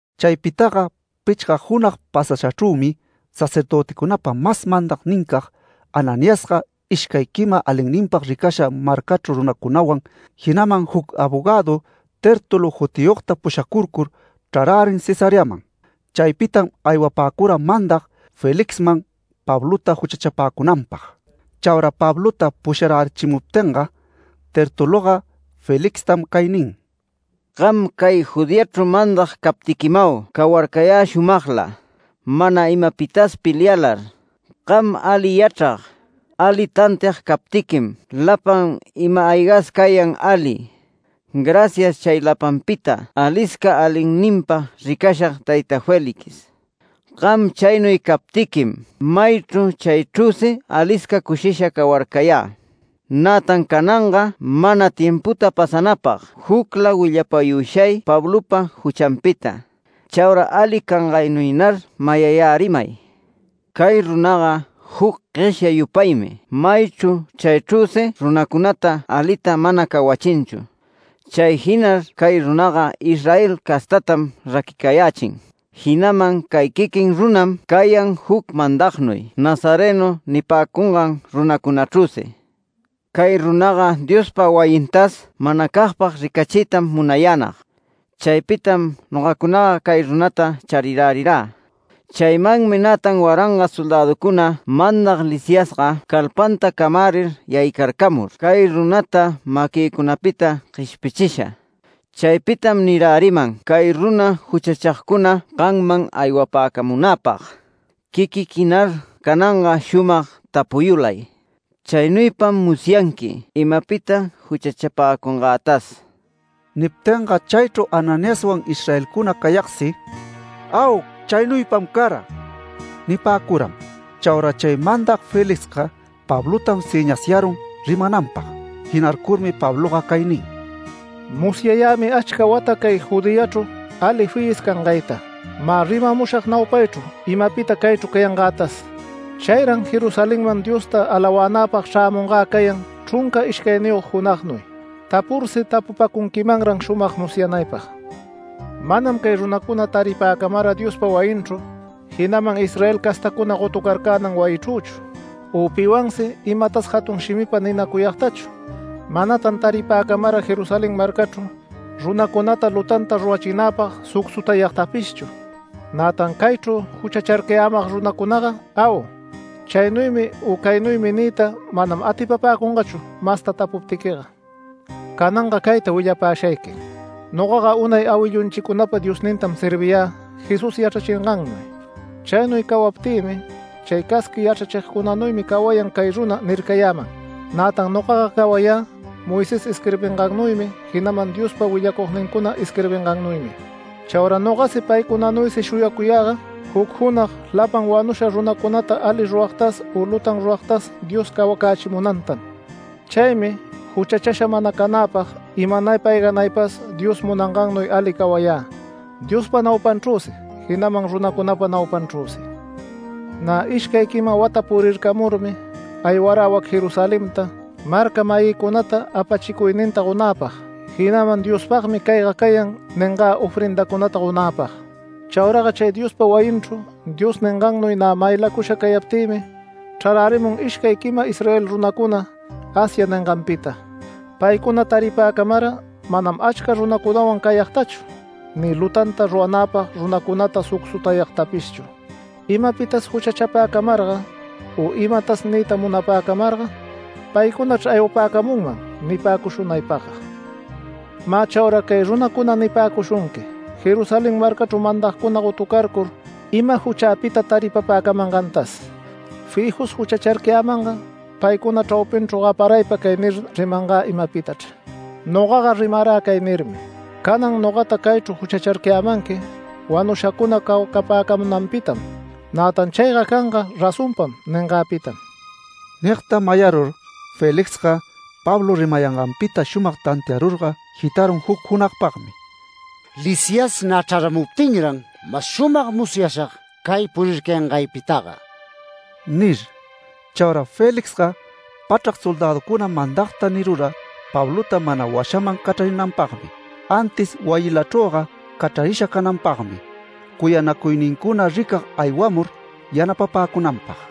Chaypitaga pichga junag pasashachrümi sacerdöticunapa mas mandagnincag Ananiasga, ishcay quima alinninpag ricasha marcachru runacunawan, jinaman juc abogadu Tértulo jutiyogta pushacurcur chrarärin Cesareaman. Chaypitam aywapäcura mandag Felixman Pablota juchachapäcunanpag. Chaura Pablota pusharachimuptinga, Tertuloga Felixtam cay nin: “Gam cay Judeachru mandag captiquimau cawarcayä shumagla, mana imapitas pelialar. Gam ali yachrag, ali tantiag captiquim lapan ima-aygas cayan ali. Gracias chay lapanpita alisca alinninpag ricasha tayta Félix. Gam chaynuy captiquim maychru chaychrüsi alisca cushisha cawarcayä. Nätan cananga mana timputa pasanäpag jucla willapayushay Pablopa juchanpita. Chaura ali cangaynuynar mayayärimay. Cay runaga juc gueshya yupaymi maychru chaychrüsi runacunata alita mana cawachinchu. Chay jinar cay runaga Israel castatam raquicayächin, jinaman cay quiquin runam cayan juc mandagnuy ‘Nazareno’ nipäcungan runacunachrüsi. Cay runaga Diospa wayintas manacagpag ricachiytam munayänag. Chaypitam nogacunaga cay runata charirärirä. Chaymanmi nätan waranga soldäducuna mandag Lisiasga calpanta camärir yaycarcamur cay runata maquïcunapita gueshpichisha. Chaypitam niräriman cay runa juchachagcuna gamman aywapäcamunäpag. Quiquiquinar cananga shumag tapuyulay. Chaynuypam musyanqui imapita juchachapäcungätas”. Niptinga chaychru Ananiaswan Israelcuna cayagsi “Au. Chaynuypam cara” nipäcuram. Chaura chay mandag Felixga Pablotam sëñasyarun rimananpag. Jinarcurmi Pabloga cay nin: “Musyayämi achca wata cay Judeachru ali fiyis cangayta. Mä rimamushag naupaychru imapita caychru cayangätas. Chayran Jerusalenman Diosta alawänäpag chrämungä cayan chrunca ishcayniyog junagnuy, tapursi tapupacunquimanran shumag musyanaypag. Manam cay runacuna taripäcamara Diospa wayinchru, jinaman Israel castacuna gotucarcänan wayichrüchu, u piwansi imatas jatun shimipa ninacuyagtachu. Manatan taripäcamara Jerusalén marcachru runacunata lutanta rurachinäpag sucsutayagtapishchu. Nätan caychru juchacharcayämag runacunaga ‘Au, chaynuymi u caynuymi’ niyta manam atipapäcungachu masta tapuptiquiga. Cananga cayta willapashayqui: Nogaga unay awillücunapa Diosnintam serviyä Jesús yachrachingannuy. Chaynuy cawaptïmi ‘Chay casqui yachrachigcunanuymi cawayan cay runa’ nircayäman. Nätan nogaga cawayä Moisés isquirbingannuymi jinaman Diospa willacugnincuna isquirbingannuymi. Chaura nogasi paycunanuysi shuyacuyäga, juc junag lapan wanusha runacunata ali ruragtas u lutan ruragtas Dios cawacächimunantam. Chaymi juchachasha mana canäpag imanaypa ayganaypas Dios munangannuy ali cawayä Diospa naupanchrüsi, jinaman runacunapa naupanchrüsi. Nä ishcay quima wata purircamurmi, aywarä wac Jerusalenta, marca-mayïcunata apachicuyninta gonäpag, jinaman ‘Diospagmi cayga canga’ ningä ofrendacunata gonäpag. Chauraga chay Diospa wayinchru Dios ningannuy nä maylacusha cayaptïmi, chrarärimun ishcay quima Israel runacuna Asia ninganpita. Paycuna taripäcamara manam achca runacunawan cayagtachu ni lutanta ruranäpag runacunata sucsutayagtapishchu. Imapitas juchachapäcamarga u imatas niyta munapäcamarga, paycunachr aywapäcamunman nipäcushunaypagga. Mä chaura cay runacuna nipäcushunqui Jerusalén marcachru mandagcuna gotucarcur ima juchäpita taripapäcamangantas. Fijus juchacharcayämanga paycuna chraupinchru gaparaypa cay nir rimangä imapitachr, nogaga rimarä cay nirmi: ‘Canan nogata caychru juchacharcayämanqui wanushacuna cawacapäcamunanpitam. Nätan chayga canga razonpam ningäpitam’”. Nigta mayarur Felixga, Pablo rimayanganpita shumag tantiayurga jitarun juc junagpagmi “Lisias nä chraramuptinran mas shumag musyashag cay purircayangaypitaga” nir. Chaura Felixga pachrac soldäducuna mandagta nirura Pablota mana washaman cachrarinanpagmi, antis wayilachrüga cachrarisha cananpagmi, cuyanacuynincuna ricag aywamur yanapapäcunanpag.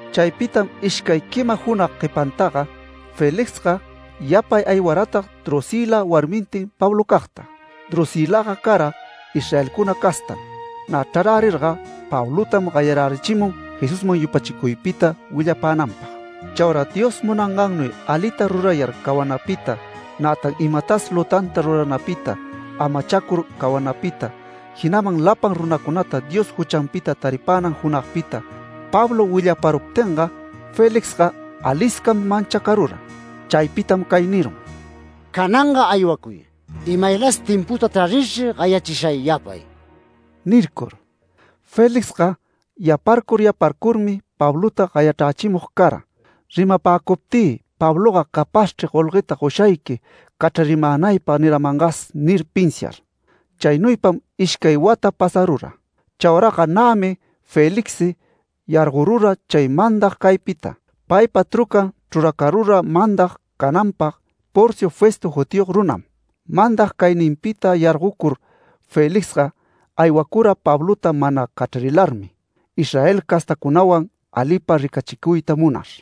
Chaypitam ishcay quima junag guepantaga, Felixga yapay aywaratag Drusïla warmintin Pablocagta. Drusïlaga cara Israelcuna castam. Nä chrarärirga, Pablotam gayarärichimun Jesusman yupachicuypita willapänanpag. Chaura Dios munangannuy alita rurayar cawanapita, nätan imatas lutanta ruranapita amacharcur cawanapita, jinaman lapan runacunata Dios juchanpita taripänan junagpita Pablo willaparuptinga, Felixga aliscam manchacarura. Chaypitam cay nirun: “Cananga aywacuy. Imaylas timputa tarirchri gayachishay yapay” nircur. Felixga yaparcur yaparcurmi Pablota gayachrächimug cara ‘Rimapäcuptï Pabloga capazchri golgueta goshayqui cachrarimänaypag niramangas’ nir pinsiar. Chaynuypam ishcay wata pasarura. Chauraga nämi Felixsi yargorura chay mandag caypita. Paypa trucan chruracarura mandag cananpag Porcio Festo jutiyog runam. Mandag cayninpita yargocur Felixga aywacura Pablota mana cachrarilarmi, Israel castacunawan alipa ricachicuyta munar.